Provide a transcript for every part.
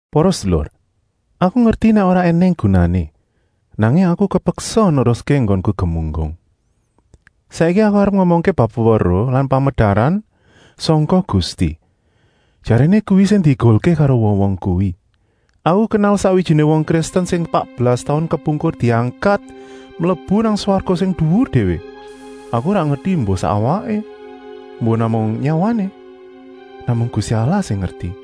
Para sedulur, aku ngerti nèk ora ènèng gunané, nanging aku kepeksa neruské enggonku gemunggung. Saiki aku arep ngomongké bab weweruh lan pamedaran sangka Gusti. Jaréné kuwi sing diegulké karo wong-wong kuwi. Aku kenal sakwijiné wong Kristen sing patbelas taun kepungkur diangkat mlebu nang swarga sing duwur déwé. Aku ora ngerti embuh sak awaké, embuh namung nyawané. Namung Gusti Allah sing ngerti.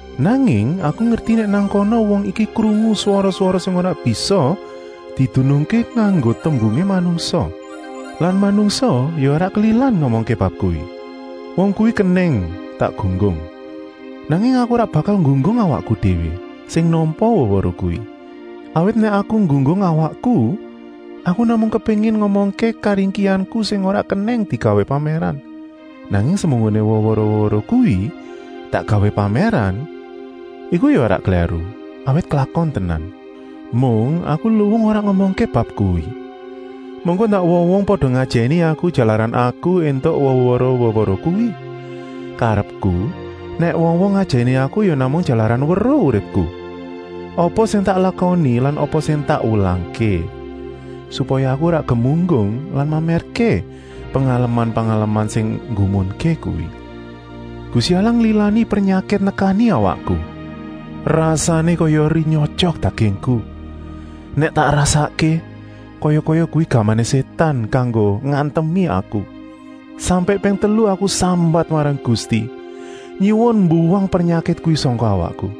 Nanging aku ngerti nèk nang kana wong iki krungu swara-swara sing ora bisa didunungké nganggo tembungé manungsa lan manungsa ya ora kelilan ngomongké bab kuwi. Wong kuwi kenèng tak gunggung, nanging aku ora bakal nggunggung awakku déwé, sing nampa weweruh kuwi. Awit nèk aku nggunggung awakku, aku namung kepéngin ngomongké karingkihanku sing ora kenèng digawé pamèran. Nanging semunggoné weweruh-weweruh kuwi tak gawé pamèran, iku ya ora klèru, awit klakon tenan. Mung aku luwung ora ngomongké bab kuwi, mengko ndak wong-wong pada ngajèni aku jalaran aku éntuk weweruh-weweruh kuwi. Karepku, nèk wong-wong ngajèni aku ya namung jalaran weruh uripku, apa sing tak lakoni lan apa sing tak wulangké. Supaya aku ora gemunggung lan mamèrké pengalaman-pengalaman sing nggumunké kuwi, Gusti Allah nglilani pernyakit nekani awakku; rasané kaya eri nyotyok dagingku. Nèk tak rasakké, kaya-kaya kuwi gamané Sétan kanggo ngantemi aku. Sampèk ping telu aku sambat marang Gusti, nyuwun mbuwang pernyakit kuwi sangka awakku.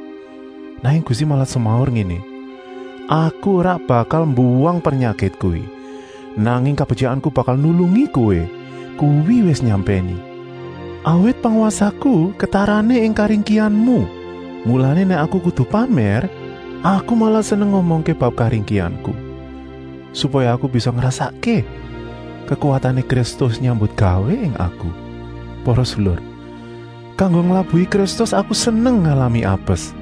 Nanging Gusti malah semaur ngéné: “Aku ora bakal mbuwang pernyakit kuwi, nanging kabetyikanku bakal nulungi kowé, kuwi wis nyampèni. Awit pangwasaku ketarané ing karingkihanmu.” Mulané nèk aku kudu pamèr, aku malah seneng ngomongké bab karingkihanku, supaya aku bisa ngrasakké kekuwatané Kristus nyambutgawé ing aku. Para sedulur, kanggo nglabuhi Kristus aku seneng ngalami apes.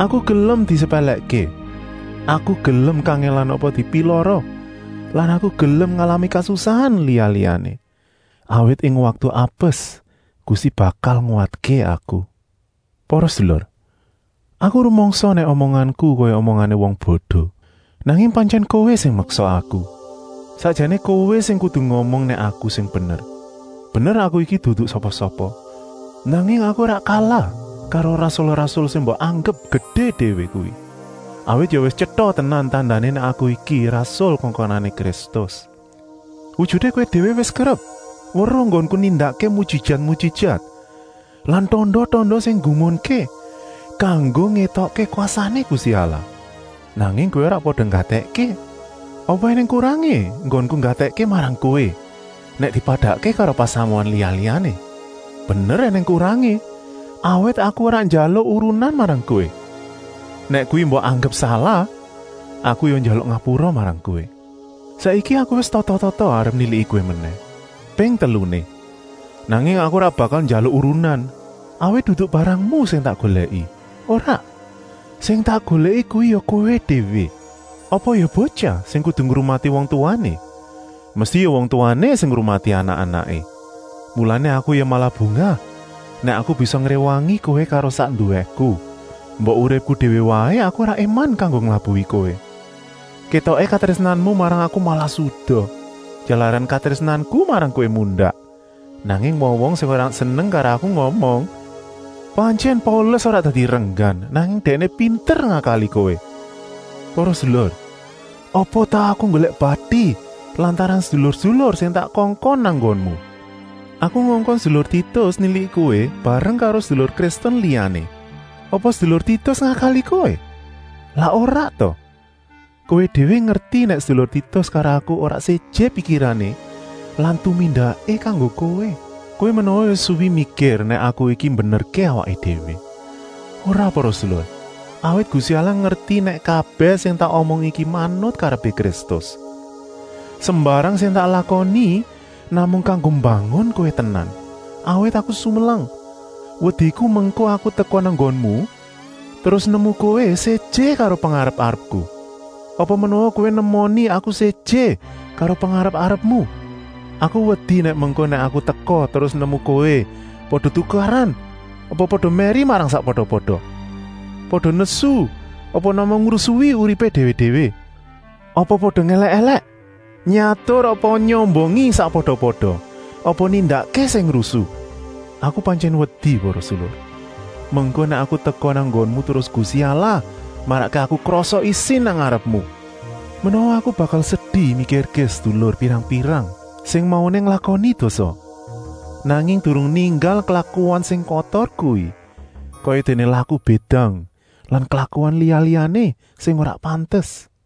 Aku gelem disepèlèkké, aku gelem kangèlan apa dipilara lan aku gelem ngalami kasusahan liya-liyané. Awit ing waktu apes Gusti bakal nguwatké aku. Para sedulur, aku rumangsa nèk omonganku kaya omongané wong bodo, nanging pantyèn kowé sing meksa aku. Sakjané kowé sing kudu ngomong nèk aku sing bener. Bener aku iki dudu sapa-sapa, nanging aku ora kalah karo rasul-rasul sing mbok anggep gedé déwé kuwi. Awit ya wis tyeta tenan tandané nèk aku iki rasul kongkonané Kristus. Wujuté kowé déwé wis kerep weruh enggonku nindakké mujijat-mujijat lan tanda-tanda sing nggumunké, kanggo ngétokké kwasané Gusti Allah. Nanging kowé ora pada nggatèkké. Apa ènèng kurangé enggonku nggatèkké marang kowé nèk dipadakké karo pasamuan liya-liyané? Bener ènèng kurangé, awit aku ora njaluk urunan marang kowé. Nèk kuwi mbok anggep salah, aku ya njaluk ngapura marang kowé. Saiki aku wis tata-tata arep niliki kowé menèh, ping teluné. Nanging aku ora bakal njaluk urunan, awit dudu barangmu sing tak golèki, ora. Sing tak golèki kuwi ya kowé déwé. Apa ya botyah sing kudu ngrumati wong tuwané, mesti ya wong tuwané sing ngrumati anak-anaké. Mulané aku ya malah bungah nèk aku bisa ngréwangi kowé karo sak nduwéku. Mbok uripku déwé waé aku ora éman kanggo nglabuhi kowé. Kétoké katrésnanmu marang aku malah suda, jalaran katrésnanku marang kowé mundak. Nanging wong-wong sing ora seneng karo aku ngomong: “Pantyèn Paulus ora dadi renggan, nanging dèkné pinter ngakali kowé.” Para sedulur, apa tau aku nggolèk bati lantaran sedulur-sedulur sing tak kongkon nang nggonmu? Aku ngongkon sedulur Titus niliki kowé bareng karo sedulur Kristen liyané. Apa sedulur Titus ngakali kowé? Lak ora ta? Kowé déwé ngerti nèk sedulur Titus karo aku ora séjé pikirané lan tumindaké kanggo kowé. Kowé menawa wis suwi mikir nèk aku iki mbenerké awakku déwé. Ora para sedulur, awit Gusti Allah ngerti nèk kabèh sing tak omong iki manut karepé Kristus. Sembarang sing tak lakoni namung kanggo mbangun kowé tenan. Awit aku sumelang, wediku mengko aku teka nang nggonmu, terus nemu kowé séjé karo pengarep-arepku. Apa menawa kowé nemoni aku séjé karo pengarep-arepmu. Aku wedi nèk mengko nèk aku teka terus nemu kowé pada tukaran apa pada mèri marang sakpada-pada, pada nesu apa namung ngurusi uripé déwé-déwé, apa pada ngèlèk-èlèk, nyatur apa nyombongi sakpada-pada apa nindakké sing rusu. Aku pantyèn wedi para sedulur, mengko nèk aku teka nang nggonmu terus Gusti Allah marakké aku krasa isin nang ngarepmu. Menawa aku bakal sedi mikirké sedulur pirang-pirang sing mauné nglakoni dosa, nanging durung ninggal klakuan sing kotor kuwi, kayadéné laku bédang lan klakuan liya-liyané sing ora pantes.